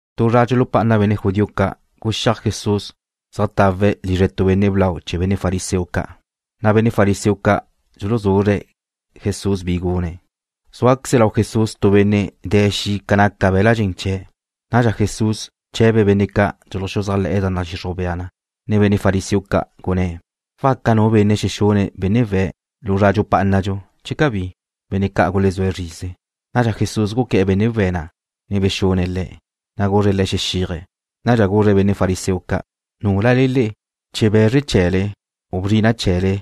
Tu zra dxulupá'ana benne' judío ca' guxíaj Jesús zeajtawe̱' lizre tu benne' blau chee̱ benne' fariseo ca', na' benne' fariseo ca' dxuluzuzre̱' Jesús bi gune̱'. Zúaqueze lau Jesús tu benne' de̱ xi' ca naca be̱l-la' dxen chee̱'. Nadxa Jesús bche̱be̱' benne' ca' dxuluxuzájle̱'e̱ da nadxixruj bea na, ne benne' fariseo ca', gunné̱': ―¿Waca nu benne' xexune̱' benne' we̱' lu zra dxupá'anadxu, che cabí? Benne' ca' gulezúe̱' zrize. Nadxa Jesús guqué̱'e̱ benne' we̱' na', ne bexune̱' le̱', na' guzre̱' le̱' xexíaje̱'. Nadxa guzre̱' benne' fariseo ca': ―¿Núlale le'e, che be̱zre chee̱le u bia chee̱le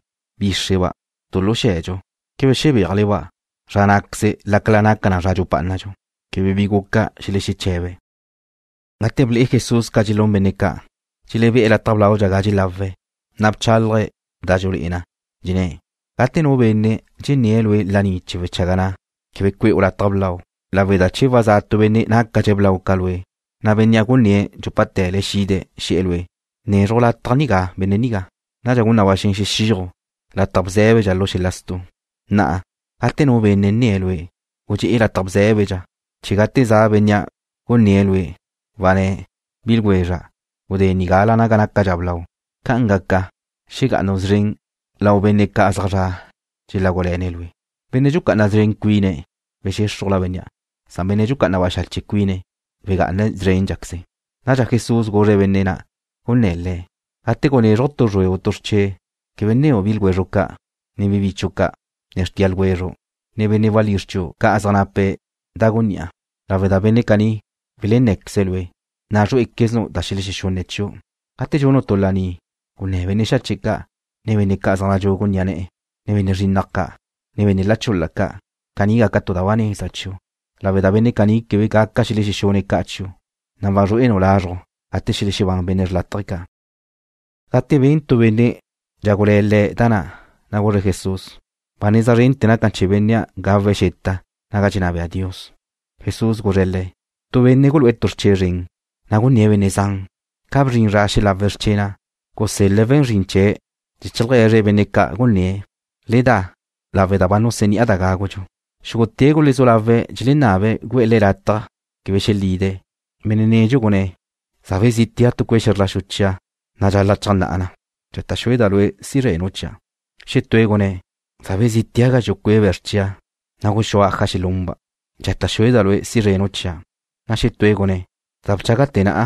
bíxreba' tu lu xe̱dxu, quebe xebéajle-ba' zra ná'queze lácala naca zra dxupá'anadxu? Quebe bi guca xelexeche̱be̱'. Gate ble'e Jesús ca dxelún benne' ca', dxelebé'e̱ lataj blaudxa ga dxelawe̱', na' bchálaje̱' da dxulé'e na, dxenné̱': ―Gate tu benne' dxenné̱' lue' laní chee̱ wechaga na', quebe cue'u lataj blau, lawe' da che wazá tu benne' nácadxe̱' blau ca lue', na' bénnea' gunné̱' dxúpate̱le xide̱' xe̱'e̱ lue': “Bnezruj lataj nigá benne' nigá.” Nadxa gun na ba xen xexíaju' lataj bzé̱bedxa lu xel-la stu'. Na'a, gate nu benne' nne̱' lue', gudxé'e lataj bzé̱bedxa, chee̱ gate za bénnea' gunné̱' lue', wanné̱': “Bi ljwezra', gudé nigala naga nácadxa blau.” Ca'an gaca, xegá'anu' szren lau benne' ca' zaj zre̱'e̱ dxelágule̱ne̱' lue'. Benne' dxucá'ana szren cuine̱', wexéxrujla bénnea', na' benne' dxucá'ana baxache' cuine̱' wegá'ana szrénqueze̱'. Nadxa Jesús guzre̱' benne' na' gunné̱' Le̱': ―Gate gunézruju' tu zrue u tu xrche' quebe nneu' bi ljwezru' ca', ne bi bichu' ca', ne xrtia ljwezru', ne benne' walízr chiu' ca' zaj nape̱' da gunní'a, lawe' da benne' caní welenné̱queze̱' lue', na' zrué'equeznu' da xelexexunne̱' chiu'. Gate dxunu' tu laní, gunné̱ benne' xache' ca', ne benne' zaj nadxugu ni'a ne̱'e̱, ne benne' zrinnaj ca', ne benne' la chul-la ca'. Caní gaca tu da ba neza chiu', lawe' da benne' caní quebe gaca xelexexunne̱' ca' chiu', na' wazrué'enu' lazrju' gate xelexebán benne' xrlátaje ca'. Gate ben tu benne' dxágule̱ Le̱' da na', na' guzre̱' Jesús: ―Ba neza zrente̱ naca na chee̱ benne' gawe̱' xeta naga dxenná bea Dios. Jesús guzre̱' le̱': ―Tu benne' gulu'e̱ tu xrche' zren, na' gunné̱' benne' zan. Ca bzrin zra xelawe̱' xrche' na', gusél-le̱' we̱n zrin chee̱' chee̱ cheaje̱zre̱' benne' ca' gunné̱': “Le da, lawe' da ba nuseni'a da gágudxu.” Xúgute̱' gulezú lawe̱' dxelenabe̱' gu'e̱ le̱' lataj quebe xelide̱'. Benne' nedxu gunné̱': “Za bezítea' tu cue' xe̱zr la xu chia', na' dxal-la' cheajnná'a na. Dxata' xueda' lue' si zrenu' chia'.” Xetúe̱' gunné̱': “Za bezítea' gazxu' cue' be̱zr chia', na' guxúa' aja xelunba'. Dxata' xueda' lue' si zrenu' chia'.” Na' xetúe̱' gunné̱': “Za bchágate̱ na'a,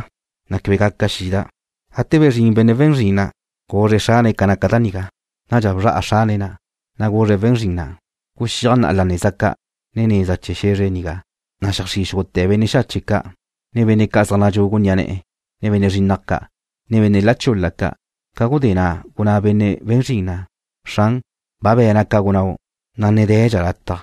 na' quebe gaca xida'.” Gate bezrín benne' we̱n zrin na', guzre̱' xrane̱' ca naca da nigá. Nadxa bzra'a xrane̱' na', na' guzre̱' we̱n zrin na': “Guxíaj na'a la neza ca', ne neza chee̱ xe̱zre nigá, na' xeajxrí' xúgute̱ benne' xache' ca', ne benne' zaj nadxugu ni'a ne̱'e̱, ne benne' zrinnaj ca', ne benne' la chul-la ca'.” Ca gudé na' gunná benne' we̱n zrin na': “Xran, ba be̱na' ca gunnáu', na' ne de̱dxa lataj.”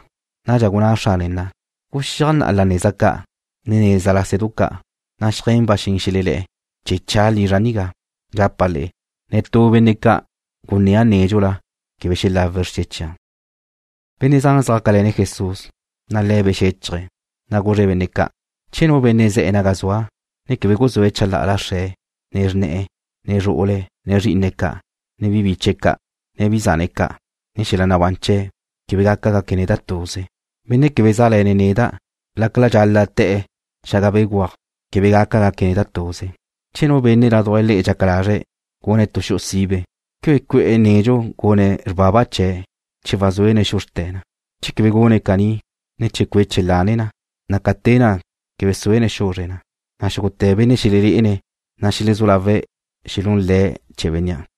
Nadxa gunná xrane̱' na': “Guxíaj na'a la neza ca', ne neza lásedu ca', na' xeajé̱n ba xen xelelé̱'e̱, chee̱ cha' lizra' nigá. Dxapa' le'e, netú benne' ca' gunnéa' nédxula quebe xelawe̱' xrche' chia'.” Benne' zan zjácale̱ne̱' Jesús, na' Le̱' bexéchaje̱', na' guzre̱' benne' ca': ―Che nu benne' ze̱'e̱ naga zua', ne quebe guzúe̱' chalá'ala xre̱', ne xrne̱'e̱, ne zru'ule̱', ne zrí'ine̱' ca', ne bi biche̱' ca', ne bi zane̱' ca', ne xel-la nabán chee̱', quebe gaca gaque̱' neda' tuze. Benne' quebe sá'le̱ne̱' neda' lácala dxal-la' te̱'e̱ xaga béguaj, quebe gaca gaque̱' neda' tuze. Che tu benne' ládujla le'e dxaca lazre̱' gune̱' tu xu'u sibe, ¿quebe cue'e̱ nedxu gune̱' xrbaba chee̱' che wazúene̱' xuzrte̱' na? Che quebe gune̱' caní, ne che cueche̱' lane na, na' ca te na' quebe suene̱' xuzre̱' na, na' xúgute̱ benne' xelelé'ene̱' na xelezú lawe̱' xelún le̱' chee̱ bénnea',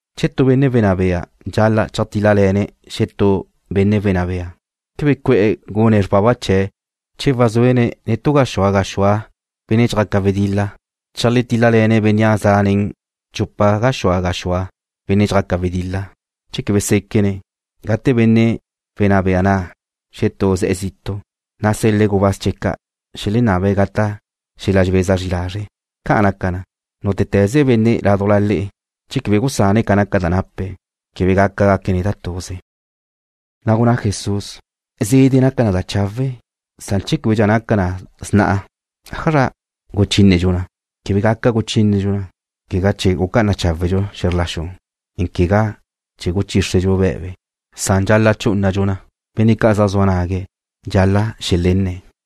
Che tu benne' wenná bea dxal-la' cheajtíl-lale̱ne̱' xetú benne' wenná bea, ¿quebe cue'e̱ gune̱' xrbaba chee̱' che wazúene̱' nen tu gaxúa gaxúa benne' dxjaque̱' wedil-la cheajtíl-lale̱ne̱' bénnea' za' nen chupa gaxúa gaxúa benne' dxjaque̱' wedil-la? Che quebe séquene̱', gate benne' wenná bea na' xetú ne ze̱'e̱ zitu', na' sel-le̱' gubáz chee̱' ca' xelenabe̱' gata' xel-la dxebeza zri lazre'. Ca' naca na, nútete̱ze benne' ládujla le'e, che quebe gusane̱' ca naca da nape̱', quebe gaca gaque̱' neda' tuze. Na' gunná Jesús: ―Zede' naca na da chawe', san che québedxa naca na sna'a, ¿ájazra guchínedxu na? Quebe gaca guchínedxu na, quegá chee̱ gucá'ana cháwedxu xe̱zr la xu, ne quegá chee̱ guchíxredxu be̱be, san dxal-la' chú'unadxu na. Benne' ca' zaj zua nague̱', dxal-la' xelenne̱'.